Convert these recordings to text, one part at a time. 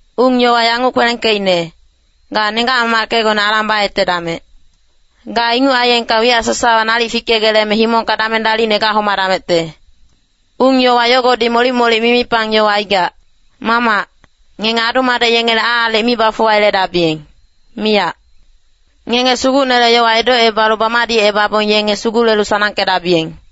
Ung-yowa yanguc kwelengkeicne, “Ga nenggac-mamackecgone alang bayetedamec. Ga inguc aiyengka wiyac sasawa nalic fikegeleme himongka dameng dalicne gahomadamecte.” Ung-yowa yogodi molic-molic mimipang yowa aigac. Mamac, ngenge adu-madec yengele aalic mi bafuwayeledabiyeng, miyac. Ngenge Sugucnele yowa edocebalu bamadicebabong yenge sugulelu sanangkedabiyeng.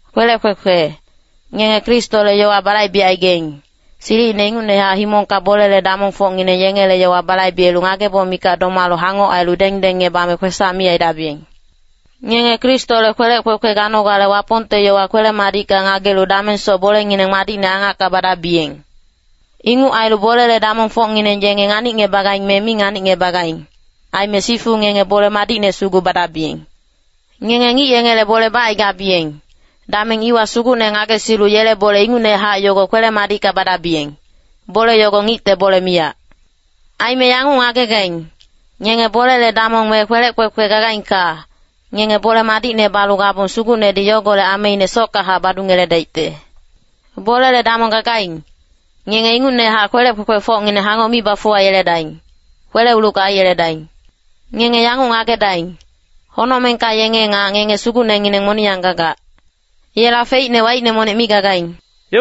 Kwelec kwekwe, ngenge Kristole yowa balaibecaigaing, silicine ingucnehac himongka bolele damongfocngineng yengele yowa balaibelu ngageboc mikac domalu hangoc ailu dengdengngebame kwesac mi aidabiyeng. Ngenge Kristole kwelec kwekwe ganogale Wapongte yowa kwele-madicka ngagelu damengsoc bolengineng madicne angacka badabiyeng. Inguc ailu bolele damongfocngineng yenge nganicngebagaing me mi nganicngebagaing, aime sifu ngenge bole madicne sugu badabiyeng. Ngenge ngic yengele bole bacaigabiyeng, dameng iwa Sugucne ngagesilu yele bole ingucnehac yogo kwele-madicka badabiyeng, bole yogo ngicte bole miyac. Aime yanguc ngagegaing, ngenge bolele damong me kwelec kwekwe gagaingka, ngenge bole madicne balu gabong Sugucnedi yogolec ameine sockahac badungeledaicte. Bolele damong gagaing, ngenge ingucnehac kwelec kwekwefocngineng hangoc mi bafuwayeledaing, kwele-ulucka aiyeledaing. Ngenge yanguc ngagedaing, honocmengka yenge nga ngenge Sugucnengineng moniyang gagac. Yela feicne waicne monic mi gagaing.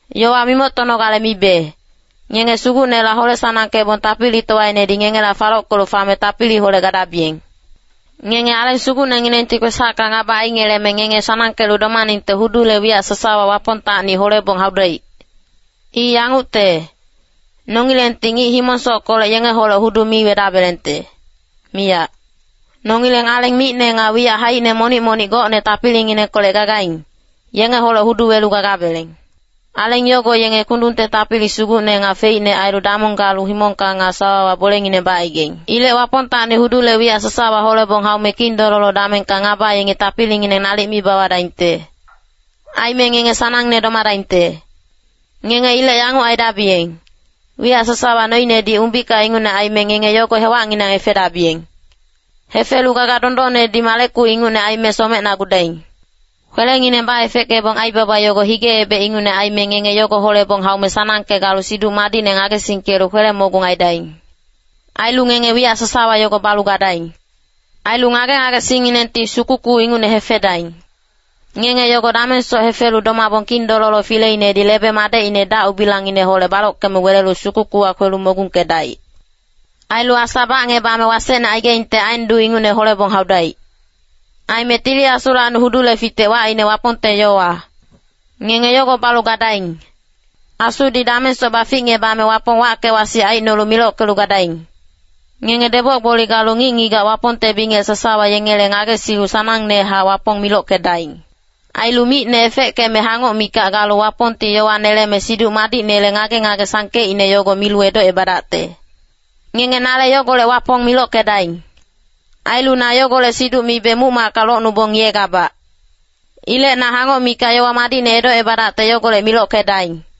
Yowa mimoctonogale mibe, ngenge Sugucnela hole-sanangkebong tapilitowainedi ngengela falockelu fame tapiliholec gadabiyeng. Ngenge Aleng Sugucnenginengti kwesacka ngaba aingeleme ngenge sanangkelu domaningte hudule wiyac sasawa Wapongtacni holebong haudaic. I yangucte, nongilengti ngic himong-sockolec yengeholec hudu mi wedabelengte, miyac. Nongileng aleng micne nga wiyac haicine monic-monic gocne tapilinginengkolec gagaing, yengeholec hudu welu gagabeleng. Aleng yogo yenge kundungte tapili sugucne nga feicne ailu damong galu himongka nga sawawa bolengineng bacaigaing. Ilec Wapongtacni hudule wiyac sasawa holebong haume kindololo damengka ngaba yengi tapilingineng nalic mi bawadaingte. Aime ngenge sanangne domadaingte. Ngenge ilec yanguc aidabiyeng, wiyac sasawa noinedi umbika ingucne aime ngenge yogo hewacnginang hefedabiyeng. Hefelu gaga dondonnedi maleku ingucne aime somecnagudaing. Kwelengineng baefeckebong aibaba yogo hige-ebec ingucne aime ngenge yogo holebong haume sanangke galu Siduc Madicne ngagesingkelu kwele-mogung aidaing. Ailu ngenge wiyac sasawa yogo balu gadaing. Ailu ngage-ngagesingnginengti sukuku ingucne hefedaing. Ngenge yogo damengsoc hefelu domabong Kindololo fileinedi lebe-madecine dac-ubilangngineholec balockeme welelu sukukuwa kwelu mogungkedaic. Ailu asa bacngebame wasecne aigaingte aen duu ingucne holebong haudaic. Aime Tili Asulacni hudule fitec wacine Wapongte yowa. Ngenge yogo balu gadaing. Asudi damengsoc baficngebame Wapong wacke-wasic aicnolu milockelu gadaing. Ngenge deboc-gboli galu ngic-ngigac Wapongte bingec sasawa yengele ngagesilu sanangnehac Wapong milockedaing. Ailu micne efeckeme hangoc mikac galu Wapongti yowa neleme Siduc Madicnele ngage-ngage sangkeicne yogo milu edocebadacte. Ngenge nale yogolec Wapong milockedaing. Ailu na yogolec siduc mibe muc-macka locnubong ngiyegabac. Ilec na hangoc mikac yowa madicne edocebadacte yogolec milockedaing.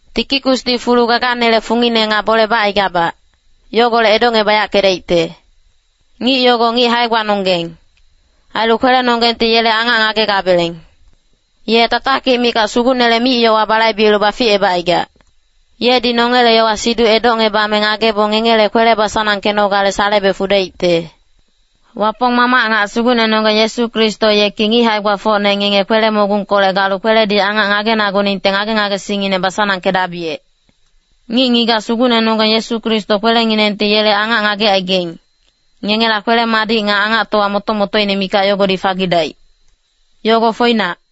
Tikikusdi fulu gaganele fungine nga bole bacaigabac, yogolec edocngebayackedaicte. Ngic yogo ngic hae-gbanonggeng, ailu kwelenonggengti yele angac ngagegabeleng. Ye tatakic mikac Sugucnele mic-yowa balaibelu baficebacaigac. Yedi nongele yowa-siduc edocngebame ngagebong ngengele kwele basanangkenogale salebe fudaicte. Wapong Mamac nga Sugucnenonggeng Yesu Kristo yeki ngic hae-gbafocne ngenge kwele-mogungkolec galu kweledi angac ngagenaguningte ngage-ngagesingngineng basanangkedabiyec. Ngic-ngigac Sugucnenonggeng Yesu Kristo kwelenginengti yele angac ngagecaigaing, ngengela kwele-madic nga angactowa moto-motoine mikac yogodi fagidaic. Yogo foinac.